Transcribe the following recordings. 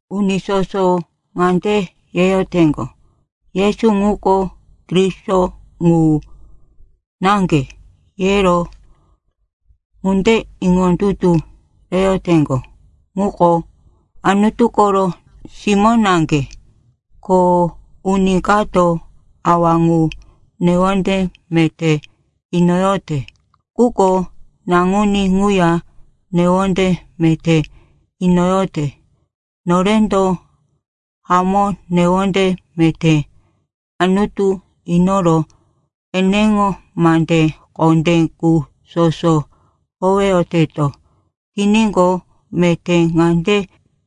Uni soso ŋande yeyoteŋgo, “Yesu ŋuko Kristo ŋu naŋge,” yero ŋunde iŋondutu reyoteŋgo ŋuko Anutu koro simó naŋge. Ko uni kato Awa ŋu newonde meté inoyote quko Naŋuní ŋuya newonde meté inoyote. Norendo hamó newonde meté Anutu inoro eneŋo mande kondé qu soso howeyoteto tiníqo, meté ŋande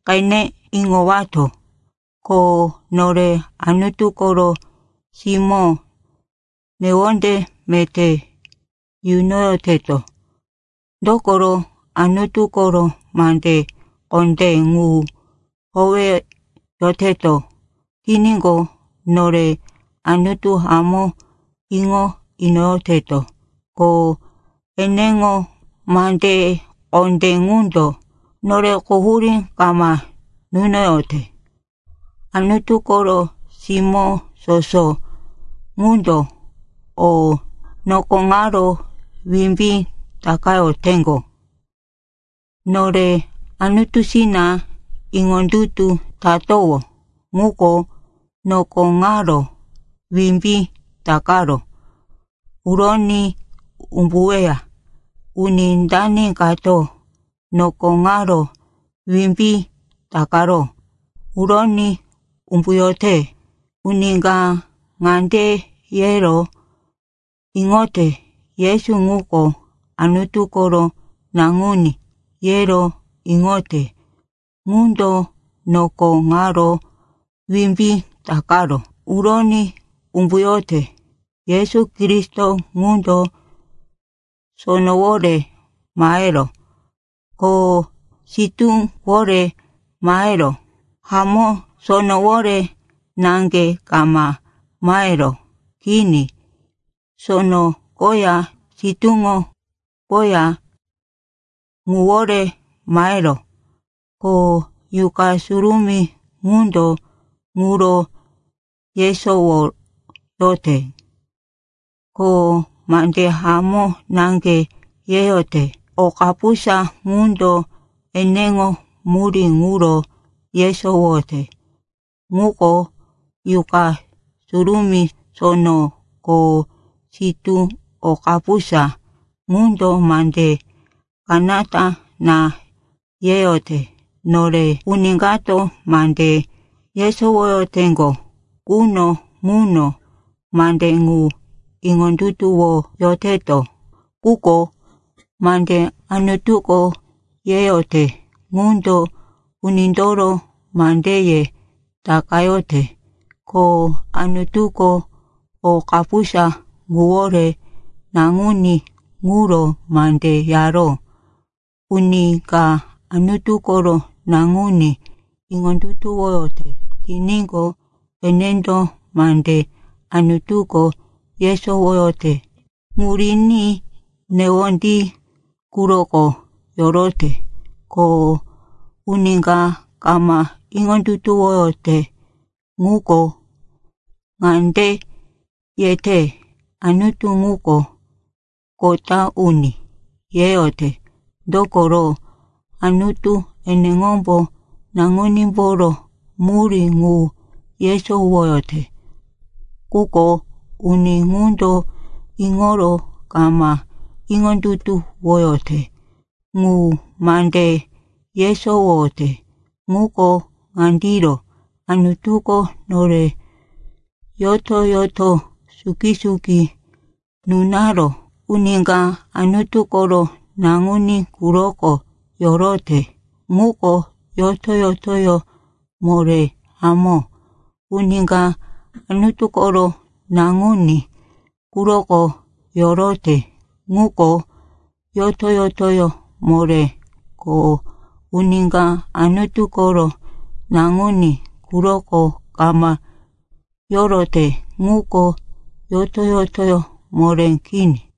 qene iŋowato, ko nore Anutu koro simó newonde meté yunoyoteto. Dokoro Anutu koro mande kondé ŋu howeyoteto tiníqo, nore Anutu hamó iŋo inoyoteto. Ko eneŋo mande kondé ŋundo nore quhurí kama nunoyote. Anutu koro simó soso ŋundo o noko ŋaro wimbí takayoteŋgo. Nore Anutusina iŋondutu tatowó ŋuko noko ŋaro wimbí takaro uroní umbuweya. Uni dani kato noko ŋaro wimbí takaro uroní umbuyote? Uni ka ŋande yero iŋote, Yesu ŋuko Anutu koro Naŋuní, yero iŋote ŋundo noko ŋaro wimbí takaro uroní umbuyote. Yesu Kristo ŋundo sonowore maheró, ko sitúwore maheró. Hamó, sonowore naŋge kama maheró, kini, sono koya sitúŋo koya ŋuwore maheró. Ko Yuqa Surumí ŋundo ŋuro yesowoyote, ko mande hamó naŋge yeyote. O kapusa ŋundo eneŋo murí ŋuro yesowoyote. Ŋuko Yuqa Surumí, sono ko sitú. O kapusa ŋundo mande kanata na yeyote. Nore uni kato mande yesowoyoteŋgo quno ŋuno mande ŋu iŋondutuwoyoteto. Quko mande Anutuko yeyote ŋundo unindoro mandeye takayote. Ko Anutuko o kapusa ŋuwore Naŋuní ŋuro mande yaró. Uni ka Anutu koro Naŋuní iŋondutuwoyote tiníqo, enendo mande Anutuko yesowoyote ŋu riní newondí quroko yorote. Ko uni ka kama iŋondutuwoyote ŋuko, ŋande yete, “Anutu ŋuko kota uni,” yeyote. Dokoro, Anutu eneŋombo Naŋunímboro murí ŋu yesowoyote, quko uni ŋundo iŋoro kama iŋondutuwoyote ŋu. Mande yesowoyote ŋuko ŋandiro, Anutuko nore yoto-yoto suki-suki nunaró. Uni ka Anutu koro Naŋuní quroko yorote ŋuko yoto-yotoyó moré. Hamó, uni ka Anutu koro Naŋuní quroko yorote, ŋuko yoto-yotoyó moré. Ko uni ka Anutu koro Naŋuní quroko kama yorote ŋuko yoto-yotoyó moré kini.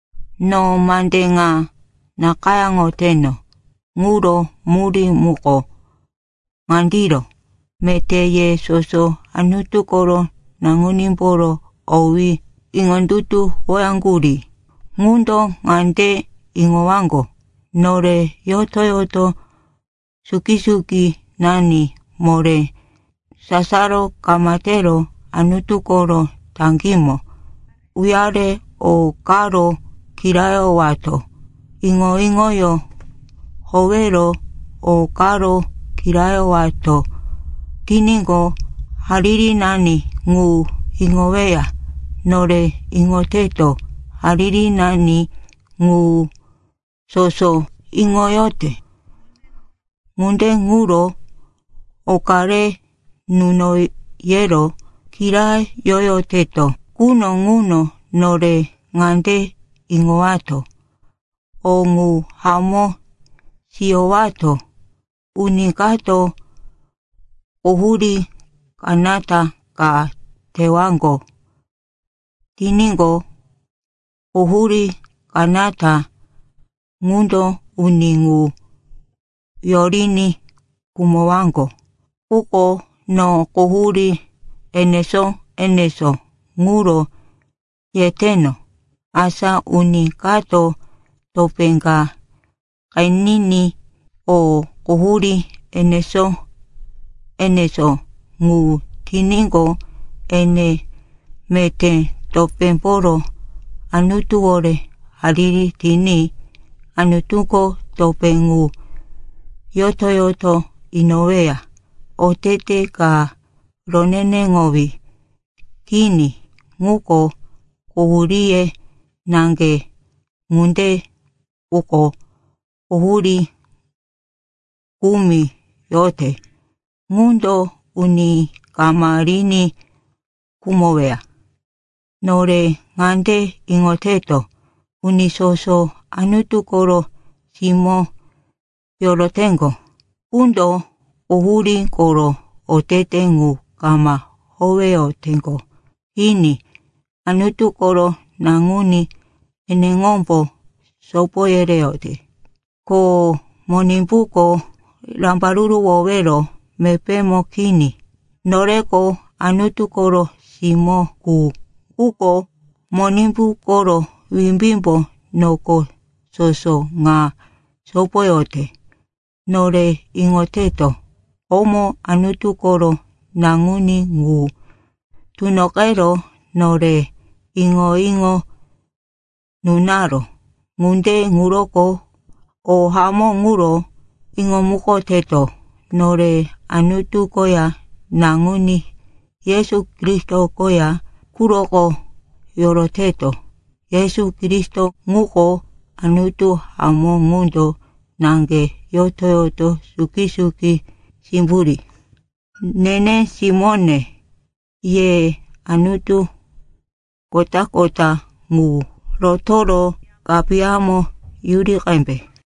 No mande ŋa nakayáŋoteno ŋuro murí muko ŋandiro: meté ye soso Anutu koro Naŋunímboro owí iŋondutuwoyaŋgurí ŋundo ŋande iŋowaŋgo, “Nore yoto-yoto suki-sukinani moré. Sasaro kama tero Anutu koro taŋgímo uyare o karo kirayowato. Iŋo-iŋoyó howero o karo kirayowato tiníqo, haririnani ŋu iŋoweya.” Nore iŋoteto, haririnani ŋu soso iŋoyote. Ŋunde ŋuro, oka re nuno, yero kirayoyoteto quno ŋuno nore ŋande iŋowato, o ŋu hamó siyowato. Uni kato quhurí kanata ka tewaŋgo tiníqo, quhurí kanata ŋundo uni ŋu yoriní khumowaŋgo. Quko no quhurí enesó-enesó ŋuro yeteno. Asa uni kato topé ka qeniní o quhurí enesó-enesó ŋu tiníqo, ene meté topémboro Anutuwore hariri tiní Anutuko topé ŋu yoto-yoto inoweya. Otete ka roneneŋowí kini ŋuko quhuríye naŋge. Ŋunde quko quhurí kumi yote ŋundo uni kama riní khumoweya. Nore ŋande iŋoteto, uni soso Anutu koro simó yoroteŋgo qundo quhurí koro otete ŋu kama howeyoteŋgo. Kini, Anutu koro Naŋuní eneŋombo sopo yereyote, ko Monimbuko rambaruruwowero mepémo kini. Noreko Anutu koro simó qu, quko Monimbu koro wimbímbo noko soso ŋa sopoyote. Nore iŋoteto, komo Anutu koro Naŋuní ŋu tunoqero nore iŋo-iŋo nunaró, ŋunde ŋuroko o hamó ŋuro iŋomukoteto. Nore Anutu koya Naŋuní Yesu Kristo koya quroko yoroteto. Yesu Kristo ŋuko Anutu hamó, ŋundo naŋge yoto-yoto suki-suki simburí. Nene simóne, ye anutu kota-kota ŋu rotoro kapiyamo yuri qembe.